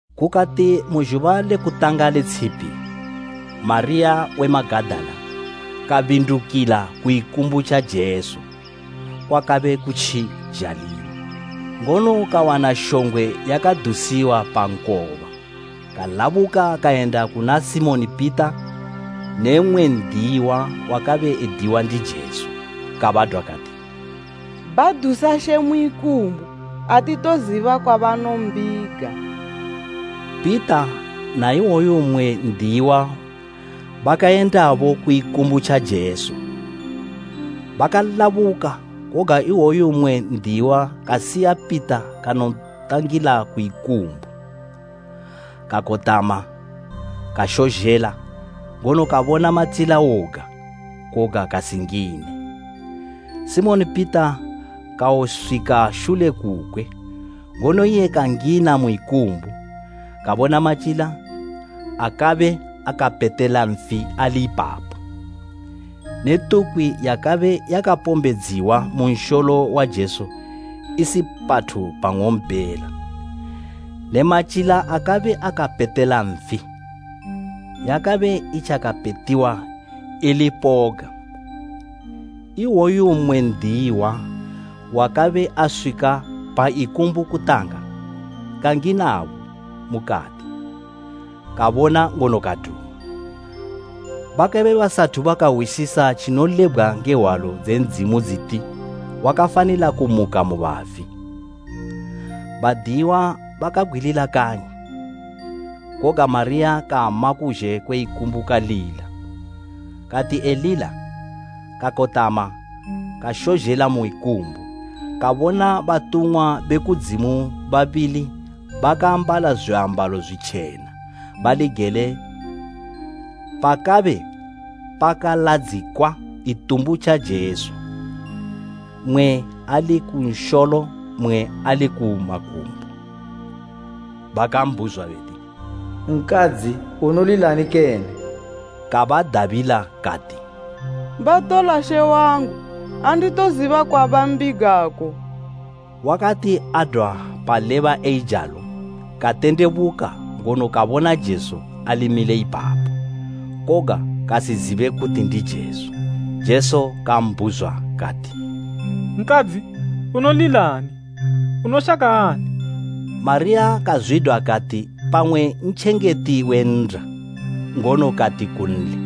Kukati mu zhuba lekutanga le tshipi, Mariya we Magadala kabindukila ku ikumbu tja Jesu, kwakabe kutji zhalima, ngono kawana shongwe yakadusiwa pa nkoba. Kalabuka kayenda kuna Simoni Pita ne mmwe n'diyiwa wakabe ediwa ndi Jesu, kabadwa kati, “Badusa She mu ikumbu, atitoziba kwabanombiga!” Pita na iwoyo mmwe n'diyiwa bakayendabo ku ikumbu tja Jesu. Bakalabuka, koga iwoyo mmwe n'diyiwa kasiya Pita kanontangila ku ikumbu. Kakotama kashozhela ngono kabona matyila woga, koga kasingine. Simoni Pita kawoswika shule kukwe, ngono iye kangina mu ikumbu. Kabona matyila akabe akapetela nfi ali ipapo, ne tukwi yakabe yakapombedziwa mu nsholo wa Jesu isi pathu pang'ompela ne matyila akabe akapetela nfi. Yakabe itjakapetiwa ili ku poga. Iwoyo mmwe n'diyiwa, wakabe aswika pa ikumbu kutanga, kanginabo mukati, kabona ngono kaduma. Bakabe basathu bakahwisisa tjinolebgwa nge Hwalo dze Ndzimu dziti, wakafanila kumuka mu bafi. Badiyiwa bakabgwilila kanyi. Koga Mariya kama kuzhe kwe ikumbu kalila. Kati elila, kakotama kashozhela mu ikumbu, kabona batumwa be kudzimu babili bakaambala zwiambalo zwitjena, bali gele pakabe pakaladzikwa itumbu tja Jesu, mmwe ali ku misholo mmwe ali ku makumbo. Bakambhuzwa beti, “Nkadzi, unolilani kene?” Kabadabila kati, “Batola She wangu, anditoziba kwabambigako!” Wakati adwa paleba eijalo katendebuka ngono kabona Jesu ali mile ipapo, koga kasizibe kuti ndi Jesu. Jesu kambhuzwa kati, “Nkadzi, unolilani? Unoshaka ani?” Mariya kazwidwa kati pamwe ntjengeti we nnda, ngono kati kunli,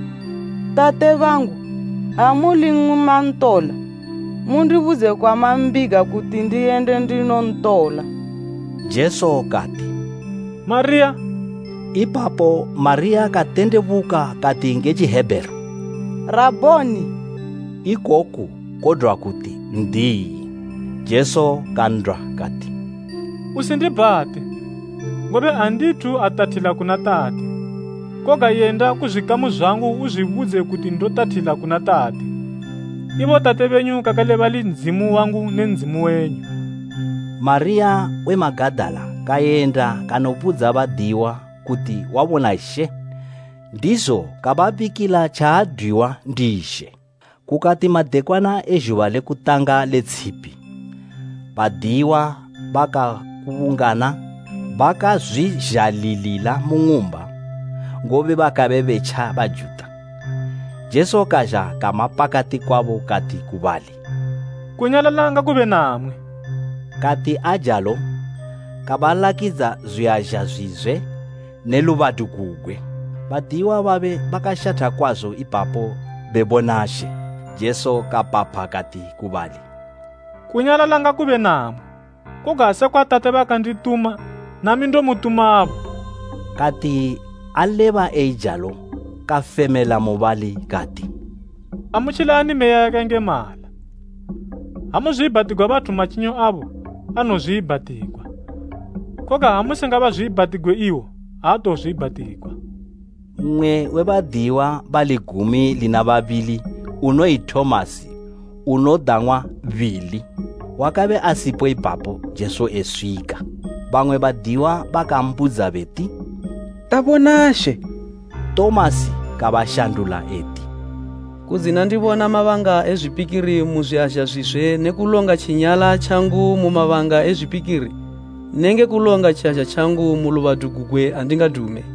“Tate bangu, ha muli imwi mantola, mundibudze kwamambiga kuti ndiyende ndinontola.” Jesu kati, “Mariya!” Ipapo Mariya katendebuka kati nge Tjihebheru, “Rabhoni!” Ikoku kodwa kuti “N'diyi.” Jesu kan'dwa kati, “Usindibhate, ngobe andithu atathila kuna Tate. Koga yenda ku zwikamu zwangu uzwibudze kuti ndotathila kuna Tate, ibo Tate benyu kakale bali Ndzimu wangu ne Ndzimu wenyu.” Mariya we Magadala kayenda kanobudza badiyiwa kuti wabona She, ndizo kababikila tjaadwiwa ndi She. Kukati madekwana e zhuba lekutanga le tshipi, badiyiwa bakakubungana bakazwizhalilila mu ng'umba, ngobe bakabe betja Bajuta. Jesu kazha kama pakati kwabo kati ku bali, “Kunyalala ngakube namwi.” Kati ajalo, kabalakidza zwiazha zwizwe ne lubadu gugwe. Badiyiwa babe bakashatha kwazo ipapo bebona She. Jesu kapapha kati ku bali, “Kunyalala ngakube namwi. Koga sekwa Tate bakandituma, nami ndomutumabo.” Kati aleba eijalo kafemela mubali kati, “Amutjilani Meya yakayengemala. Ha muzwiibhatigwa bathu matjinyo abo, anozwiibhatigwa, koga ha musingabazwiibhatigwe iwo, aatozwiibhatigwa.” Mmwe we badiyiwa bali gumi lina babili unoyi Tomasi unodang'wa Bili, wakabe asipo ipapo Jesu eswika. Bamwe badiyiwa bakambudza beti, “Tabona She!” Tomasi kabashandula eti, “Kudzina ndibona mabanga e zwipikiri mu zwiazha zwizwe ne kulonga tjinyala tjangu mu mabanga e zwipikiri nenge kulonga tjiazha tjangu mu lubadu gugwe, andingadume.”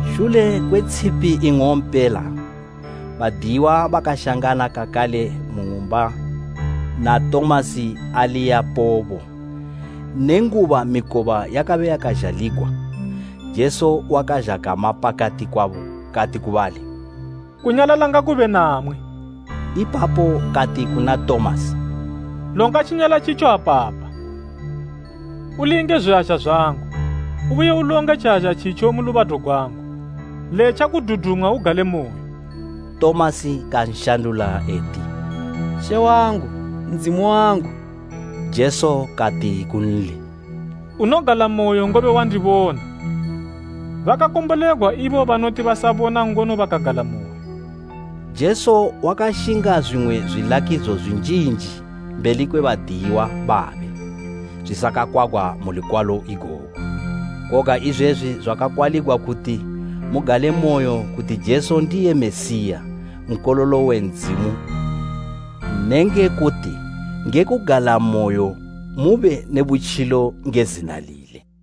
Shule kwe tshipi ing'ompela, badiyiwa bakashangana kakale mu ng'umba na Tomasi ali yapobo. Nenguba mikoba yakabe yakazhaligwa, Jesu wakazha kama pakati kwabo kati ku bali, “Kunyalala ngakube namwi.” Ipapo kati kuna Tomasi, “Longa tjinyala tjitjo apapa, ulinge zwiazha zwangu, ubuye ulonge tjiazha tjitjo mu lubadu gwangu. Letja kududumwa ugalemoyo!” Tomasi kanshandula eti, “She wangu! Ndzimu wangu!” Jesu kati kunli, “Unogalamoyo, ngobe wandibona. Bakakombolegwa ibo banoti basabona ngono bakagalamoyo.” Jesu wakashinga zwimwe zwilakidzo zwinjinji mbeli kwe badiyiwa babe zwisakakwagwa mu lukwalo igogu. Koga izwezwi zwakakwaligwa kuti mugalemoyo kuti Jesu ndiye Mesiya, Nkololo we Ndzimu ne nge kuti nge kugalamoyo mube ne butjilo nge zina lile.